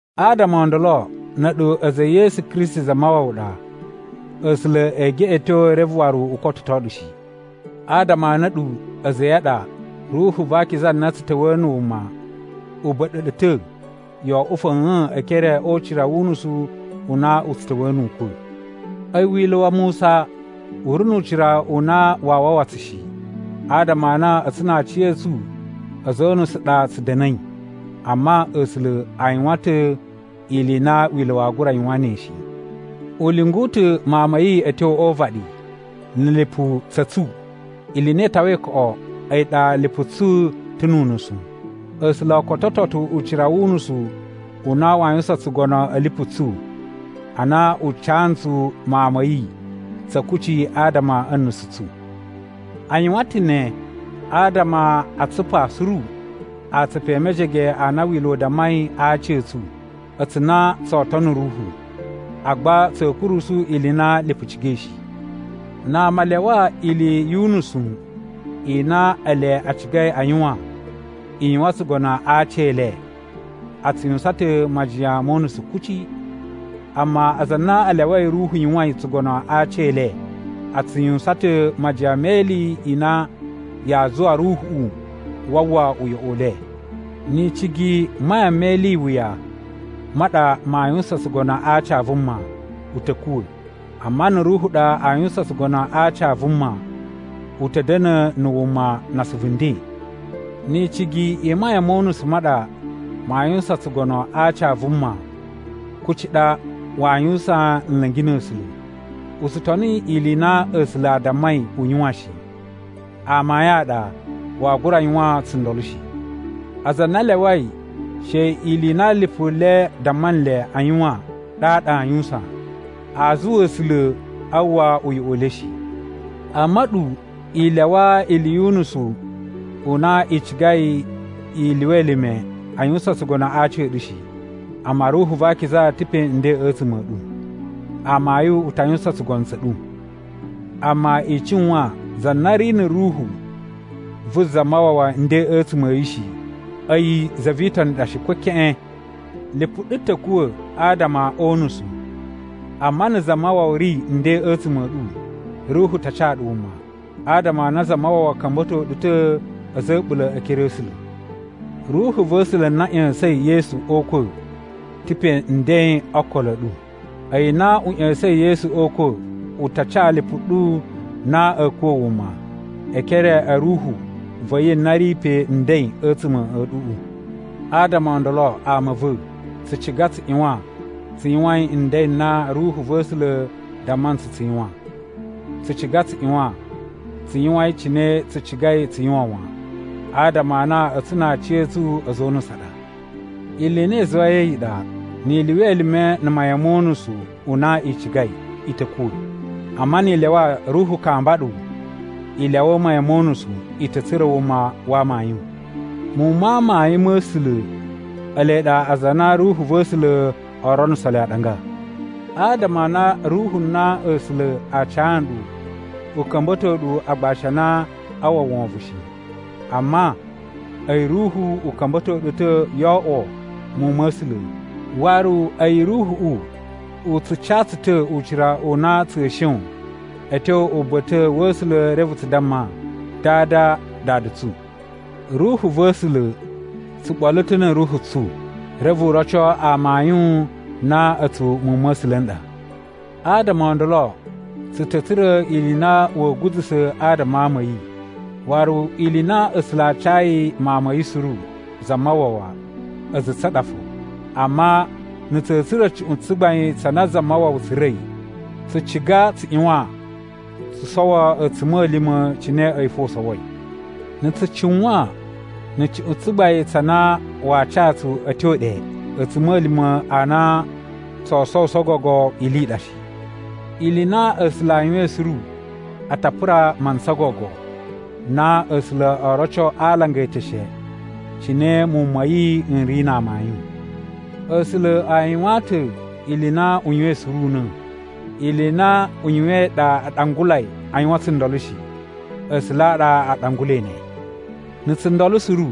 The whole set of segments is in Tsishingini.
Adama o ndolo, na̱ a̱ɗu a̱za̱ e Yesu Kristi Zamawawa ɗa, A̱sula̱ ee geꞌeto reve waru u kototo ɗu shi. Adama a na a̱ɗu a̱za̱ a̱ yi a ɗa, Ruhu va Akiza na tsu ta̱wa̱a̱ na̱ wuma u ba̱ɗa̱ ɗu ta̱ yo oꞌwo fa̱a̱n e ekere o ucira wu unusu u na u tsu ta̱wa̱a̱ nu ukwa̱. A̱yi Wila̱ wa Musa u ri nu ucira u na waa wawa tsu shi, adama a na a̱tsu na aciya̱tsu a̱za̱ o unusu a ɗa tsu da̱na̱i. Amma A̱sula̱ a yuwan ta̱ ili i na Wila̱ waa gura yuwan ne shi. U lyungu ta̱ Mawun ma̱ yi a̱ tyo o uvaɗi na̱ lipu tsa̱ tsu, ili i na i tawai koꞌo a̱yi ɗa lipu tsu ta̱ nu unusu. A̱sula̱ o kototo ta̱ ucira wu unusu u na waa yuwusan tsugono a̱ lipu tsu, ana u ca ntsu Mawun ma̱ yi tsa̱ kucci adama a̱ nusu tsu. A yuwan ta̱ ne adama a tsupa suru atsupu e mejege a na wila̱ u dammai a aci a̱ tsu, a̱tsu na tsoo tono Ruhu, agba tsa̱a̱ kurusu ili i na lipu cigai shi. Na ama a lyawa ili yu unusu i na ele a cigai a yuwan, i yuwan tsugono a aci e le, a tsu yuwusan ta̱ majiyan mo unusu kuci. Amma aza a na a lyawai Ruhu yuwain tsugono a aci e le, a tsu yuwusan ta̱ majiyan me ili i na yaa zuwa Ruhuꞌu waa uwwa uyoꞌo u le. Ni icigi i mayan me ili i wuya ma ɗa maa yuwusan tsugono a aci a vuma, u ta̱ kuwa̱. Amma na̱ Ruhu ɗa a yuwusan tsugono a aci a vuma, u ta̱ da̱na̱ na̱ wuma na asuvu nden. Ni icigi i mayan mo unusu ma ɗa maa yuwusan tsugono a aci a vuma, kuci ɗa waa yuwusan nla̱ngi na̱ A̱sula̱. U tsu toni ili i na A̱sula̱ a dammai u yuwan shi. Amayun a ɗa, waa gura yuwan tsundolo shi. Aza a na a lyawai she ili i na lipu le damma nle a yuwan ɗaɗa aa yuwusan, aa zuwa A̱sula̱ a uwwa uyoꞌo u le shi. Amma a̱ɗu i lyawa ili yu unusu u na i cigai i lyuwa elime a yuwusan tsugono a aci a̱ ɗu shi. Amma Ruhu va Akiza ta̱ pe nden a̱tsuma̱ a̱ ɗu, amayun u ta yuwusan tsugono tsa̱ ɗu. (Amma i cuwan za na ri na̱ Ruhu vu Zamawawa nden a̱tsuma̱ a̱ yi shi, a̱yi za vi Itoni ɗa shi, ko keꞌen.) Lipu ɗu ta̱ kuwa̱ adama o unusu. Amma na̱ Zamawawa ri nden a̱tsuma̱ a̱ ɗu, Ruhu ta ca ɗu wuma, adama a na Zamawawa ka̱mba̱to ɗu ta̱ a̱za̱ a̱ a̱ɓula̱ e ekere a̱ A̱sula̱. Ruhu va̱ A̱sula̱ na ꞌya̱sa̱in Yesu o ukwa̱ ta̱ pe nden o okolo a̱ ɗu. A̱yi na u ꞌya̱sa̱in Yesu o ukwa̱ u ta ca lipu ɗu na a̱ kuwa̱ wuma, e ekere a̱ Ruhu va̱ yi na ri pe nden a̱tsuma̱ a̱ ɗuꞌu. Adama o ndolo ama a̱ va̱, tsu ciga tsu ꞌyuwan tsu yuwain nden n na Ruhu va̱ A̱sula̱ damma ntsu tsu yuwan. Tsu ciga tsu ꞌyuwan tsu yuwain cine tsu cigai tsu yuwan wan, adama a na a̱tsu na aciya̱tsu a̱za̱ o unusu a ɗa. Ili i na i zuwai a̱yi ɗa, ni i lyuwa elime na̱ mayan mo unusu u na i cigai, i ta̱ kuwa̱. Amma ni i lyawa Ruhu kamba ɗu i lyawa mayan mo unusu, i ta̱ tsura̱ wuma wa amayun. Muwun ma amayun ma̱ A̱sula̱ ele ɗa aza a na Ruhu va̱ A̱sula̱ o ronuso le aɗanga. Adama a na Ruhu na A̱sula̱ a ca nɗu u ka̱mba̱to ɗu agbashi a na aa uwwa wovon shi. Amma, a̱yi Ruhu u ka̱mba̱to ɗu ta̱ yo oꞌwo muwun ma̱ A̱sula̱, waru a̱yi Ruhuꞌu u tsu ca tsu ta̱ ucira u na tsa̱a̱ shon a̱ tyo uba̱ta̱ wa̱ A̱sula̱ reve tsu damma, “Dada! Dada tsu!” Ruhu va̱ A̱sula̱ tsu ɓolo ta̱ na̱ ruhu tsu, reve u roco amayun na a̱tsu muwun ma̱ A̱sula̱ n ɗa. Adama o ndolo, tsu ta̱ tsura̱ ili i na wa̱a̱ guza̱sa̱ adama a ama a̱ yi. Waru ili i na A̱sula̱ a cayi Mawun ma̱ yi suru, Zamawawa, a̱za̱ a̱ tsu a ɗa fo. Amma na̱ tsa̱a̱ tsura̱ cuꞌun tsugbain tsa na Zamawawa tsura̱i, tsu ciga tsu ꞌyuwan tsu sowo a̱tsuma̱lima̱ cine a̱yi fo u sowoi. Na̱ tsu cuwan na̱ cuꞌun tsugbain tsa na waa ca tsu a̱ tyo ɗe, a̱tsuma̱lima̱ a na tsoo sowuso gogo ili i ɗa shi. Ili i na A̱sula̱ a yuwain suru a ta pura mantsa gogo na A̱sula̱ oo roco a alanga e eteshe cine muwun ma̱ yi n ri na amayun. A̱sula̱ a yuwaan ta̱ ili i na u yuwain suru una̱. Ili i na u yuwain ɗa a ɗangulai a yuwan tsundolo shi, A̱sula̱ a ɗa a ɗangulai ne. Na̱ tsundolo suru,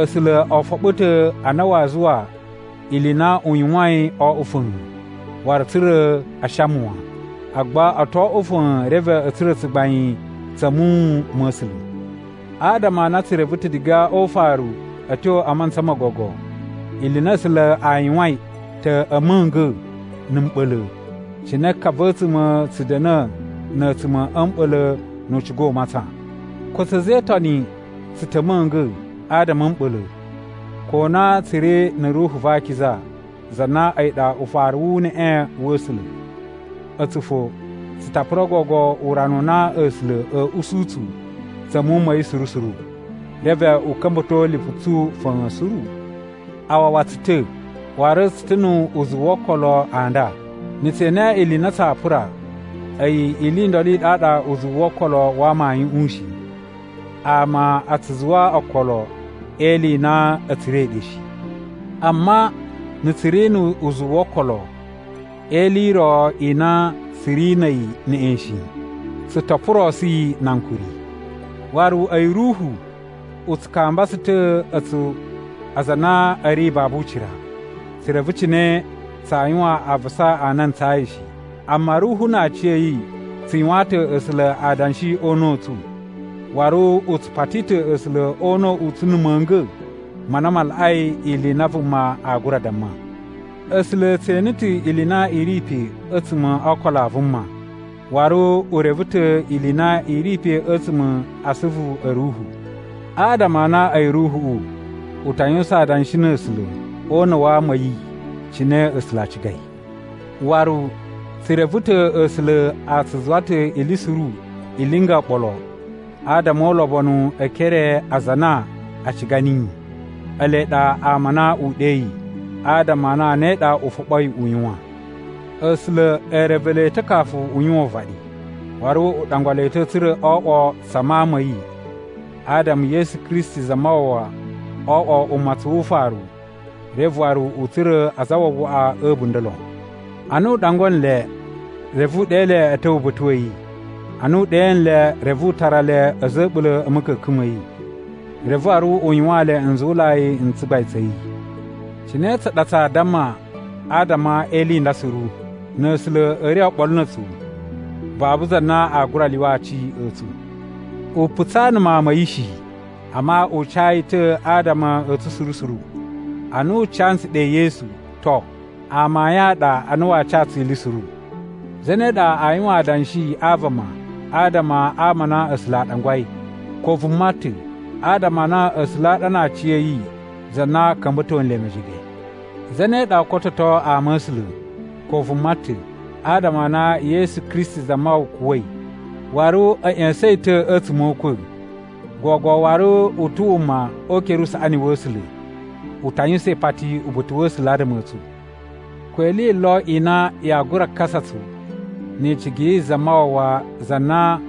A̱sula̱ o foɓo ta̱ a na waa zuwa ili i na u yuwain o oꞌwo fa̱a̱n, waru tsa̱ra̱ a shama wan, agba o to oꞌwo fa̱a̱n reve a̱ tsura̱ tsugbain tsa̱ muwun ma̱ A̱sula̱. Adama a na tsu reve ta̱ diga o ufaru a̱ tyo a mantsa mo gogo ili i na A̱sula̱ a yuwain ta̱ a̱ ma̱nga̱ na̱ mɓa̱la̱, cine ka va̱ a̱a̱tsuma̱ tsu da̱na̱ na̱ a̱a̱tsuma̱ a̱ mɓa̱la̱ nu u ciga u matsan. Ko a̱tsu a̱za̱ e Itoni tsu ta̱ a̱ ma̱nga̱ adama a̱ mɓa̱la̱, ko na tsu ri na̱ Ruhu va Akiza za na a̱yi ɗa ufaru wu uneꞌe wa̱ A̱sula̱. A̱tsu fo, tsu ta pura gogo urana u na A̱sula̱ a̱a̱ usu tsu tsa̱ muwun ma̱ yi suru suru, reve u ka̱mba̱to lipu tsu fa̱a̱n suru. A wawa tsu ta̱, waru tsu ta̱ nu uzuwu wo okolo a nda. Na̱ tse ene ili i na tsaa pura, a̱yi ili i ndolo i ɗaɗa uzuwu wo okolo wa amayuꞌun shi. Ama a tsu zuwa okolo e ili i na a̱ tsura̱i ɗe shi. Amma na̱ tsu ri nu uzuwu wo okolo e ili i ro i na tsu ri na̱ a̱yi neꞌen shi, tsu to purosu yi na ankuri. Waru a̱yi Ruhu u tsu kamba tsu ta̱ a̱tsu aza a na a̱ ri babu ucira. Tsu reve cine tsaa yuwan avasa a na a ntsayi shi. Amma Ruhu na aciya̱yi tsu yuwaan ta̱ A̱sula̱ adanshi o una̱ u tsu, waru u tsu pati ta̱ A̱sula̱ o una̱ u tsu na̱ ma̱nga̱ ma na ma laꞌai ili i na vuma aa gura damma. A̱sula̱ e tse ene ta̱ ili i na i ri pe a̱tsuma̱ o ookolo a vuma. Waru u reve ta̱ ili i na i ri pe a̱tsuma̱ a asuvu a̱ Ruhu, adama a na a̱yi Ruhuꞌu u ta yuwusan adanshi na̱ A̱sula̱ o una̱ wa ama a̱ yi cine A̱sula̱ a cigai. Waru tsu reve ta̱ A̱sula̱ a tsu zuwa ta̱ ili suru i linga oɓolo adama o ulobonu e ekere a aza a na a ciga niyi. Ele ɗa ama a na u ɗeyi, adama a na ne ɗa u foɓoi u yuwan. A̱sula̱ e reve le ta̱ kafu u yuwan uvaɗi, waru u ɗangwa le ta̱ tsa̱ra̱ o oꞌwo tsa Mawun ma̱ yi, adama Yesu Kristi Zamawawa wo oꞌwo umatsun wu ufaru reve waru u tsura̱ azawawaꞌa a̱ a̱bunda̱ lon. Ana u ɗangwa nle, reve u ɗe le a̱ ta̱wa̱ uba̱ta̱ wa̱ yi. Ana u ɗe nle, reve u tara le a̱za̱ a̱ a̱ɓula̱ a̱ ma̱ka̱ka̱n ma̱ yi, reve waru u yuwaan le nzuwulai n tsugbain tsa̱ yi. Cine tsa ɗa tsaa damma adama e ili i nda suru? Na̱ A̱sula̱ a̱ ri oɓolo na̱ a̱tsu, babu za na aa gura lyuwa aci a̱ tsu. U putsaa na̱ Mawun ma̱ yi shi, amma u ca yi ta̱ adama a̱ tsu suru suru. Ana u ca ntsu ɗe Yesu, to, amayun a ɗa a na waa ca tsu ili suru. Zane ɗa aa yuwan adanshi a vama adama a ama a na A̱sula̱ a ɗangwai? Ko vuma ta̱, adama a na A̱sula̱ a ɗa na aciya̱yi za na ka̱mba̱to nle mejege. Zane ɗa oo kototo ama a̱ A̱sula̱? Ko vuma ta̱, adama a na Yesu Kristi Zamawawa kuwa̱i, waru a̱ ꞌya̱sa̱n yi ta̱ a̱tsuma̱ o ukwa̱, gogo waru u ta̱ wuma o ukere usaꞌani wa̱ A̱sula̱, u ta yuwusan ipati uba̱ta̱ wa̱ A̱sula̱ adama a̱ tsu. Ko ili yi lo i na yaa gura kasa tsu ni icigi yi Zamawawa za na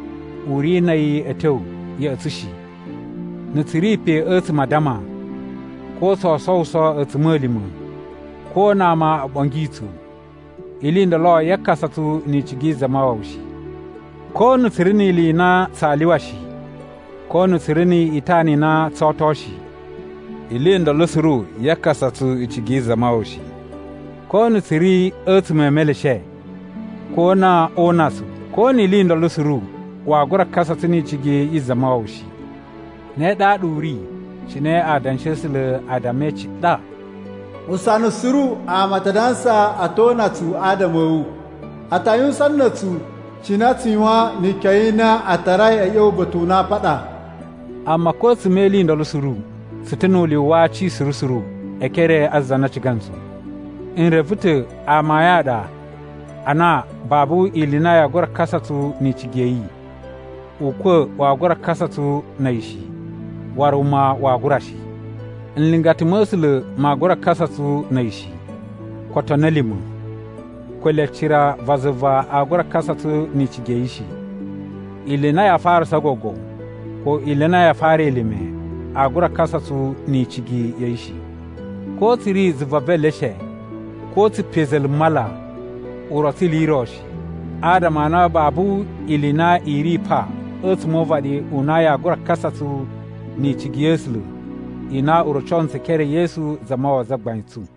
u ri na̱ a̱yi a̱ tyo ya̱ꞌa̱ tsu shi. Na̱ tsu ri pe a̱tsuma̱ a addama, ko tsoo sowuso a̱tsuma̱lima̱, ko na ama o ɓongi tsu, ili i ndolo yaa kasa tsu ni icigi yi Zamawawa shi. Ko na̱ tsu ri ni ili i na tsaa lyuwa shi, ko na̱ tsu ri ni itana i na tsoo oto shi, ili i ndolo suru yaa kasa tsu in icigi yi Zamawawa shi. Ko na̱ tsu ri a̱tsuma̱ e meleshe, ko na oo una tsu, ko ni ili i ndolo suru waa gura kasa tsu ni icigi yi Zamawawa shi. Ne ɗaɗa u ri cine Adanshi a̱ A̱sula̱ a dammai ciɗa: “Usana suru ama a ta dansa a̱ to una tsu adama a̱ wu, a ta yuwusan na̱ a̱tsu cine a tsu yuwan ni ikyon i na tarai a̱ ꞌya̱wa̱ uba̱ta̱ u na aa paɗa.” Amma ko a̱tsuma̱ e ili i ndolo suru, tsu ta̱ nu ulyuwu wa aci suru suru e ekere a za na ciga ntsu! N reve ta̱ amayun a ɗa a na babu ili i na yaa gura kasa tsu ni icigi ya̱ yi: Ukwa̱ waa gura kasa tsu na̱ a̱yi shi, waru wuma waa gura shi. Nlingata ma̱ A̱sula̱ maa gura kasa tsu na̱ a̱yi shi, ko otoni a̱ lima̱. Ko ele cira va zuva aa gura kasa tsu ni icigi ya̱ yi shi. Ili i na yaa farasa gogo, ko ili i na yaa fara elime aa gura kasa tsu ni icigi ya̱ yi shi. Ko tsu ri zuva ve eleshe, ko tsu pe za̱la̱ mala, u rotso ili i ro shi, adama a na babu ili i na i ri pa a̱tsuma̱ o uvaɗi u na yaa gura kasa tsu ni icigi ya̱ A̱sula̱ i na u roco ntsu e ekere e Yesu Zamawawa Zagbain tsu.